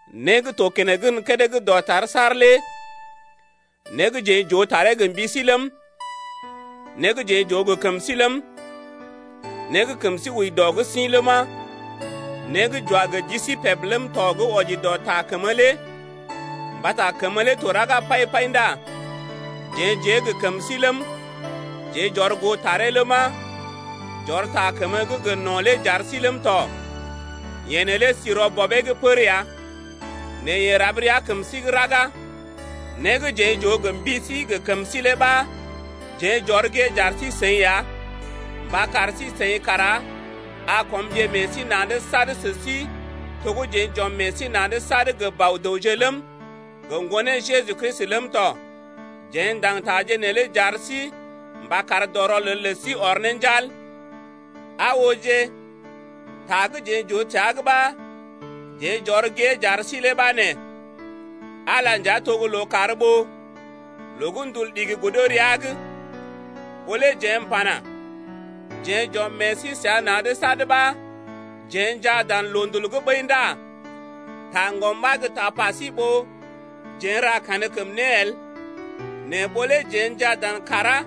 Né gə́ to keneŋ gən kédé gə́ dɔtar saar lé né gə́ jeḛ j’oo taree gə mbi sí ləm, né gə́ jeḛ j’oo gə kəm sí ləm, né gə́ kəm sí wəi dɔ’g sḭ ləma, né gə́ j’wa gə ji sí peb ləm tɔ gə́ wɔji dɔ Ta kəmə lé (mbata kəmə lé to raga pai-pai ndá jeḛ j’ée gə kəm sí ləm, jeḛ j’ɔr goo taree ləma, j’ɔr ta kəmə gə́ gə no̰ lé j’ar sí ləm tɔ. Yeḛ neelé sí rɔ Bɔbee’g pər ya nɛ yeḛ rab rəa kəm sí’g raga). Né gə́ jeḛ j’oo gə mbi sí gə kəm sí lé ɓa jeḛ j’ɔr gée j’ar sí-seḭ ya mba kar sí-seḭ kara a kɔmje ne meḛ sí na̰’d sad sə sí to gə́ jeḛ j’ɔm meḛ sí na̰’d sad gə Bɔ-dəwje ləm, gə Ŋgonee Jeju Kristi ləm tɔ. Jeḛ ndaŋg taje neelé j’ar sí mba kar dɔ rɔlel lə sí ɔr ne njal. Aa ooje, ta gə́ jeḛ j’oo təa’g ɓa, jeḛ j’ɔr gée j’ar sí lé ɓa nee: Ala nja to gə́ lookàr ɓó loo gə́ ndul ɗigi godo rəa’g. Ɓó lé jeḛ m’pana: Jeḛ j’ɔm meḛ sí səa na̰’d sad ɓa jeḛ njaa dan loondul’g ɓəi ndá taŋgɔm ɓa gə́ tapa sí ɓó jeḛ n’ra kankəm né el. Nɛ ɓó lé jeḛ njaa dan kàrá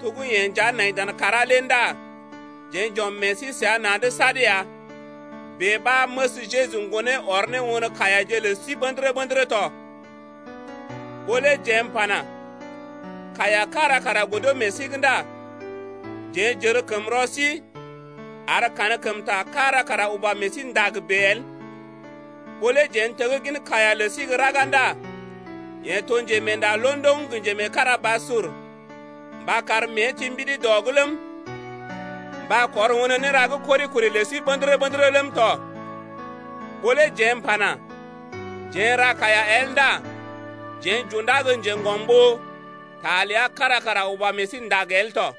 to gə́ yeḛ nja nai dan kàrá lé ndá jeḛ j’ɔm meḛ sí na̰’d sad ya, bèe ɓa məs Jeju Ŋgonee ɔr ne won kaiyaje lə sí ɓə̰dərə-ɓə̰dərə tɔ. Ɓó lé jeḛ m’pana: Kaiya kára kara godo meḛ sí’g ndá jeḛ j’ər kəm rɔ sí, ar kankəmta kára kara uba meḛ sí ndag bèe el. Ɓó lé jeḛ n’teggin kaiya lə sí gə́ raga ndá yeḛ to njemeenda londoŋ gə njemeekarabasur mba kar mée ti mbidi dɔ’g ləm, mba kɔr won néra gə́ kori-kori lə sí ɓə̰dərə-ɓə̰dərə ləm tɔ. Ɓó lé jeḛ m’pana: Jeḛ n’ra kaiya el ndá jeḛ j’undá gə njeŋgɔm ɓó ta ləa kára kara uba meḛ sí ndag el tɔ.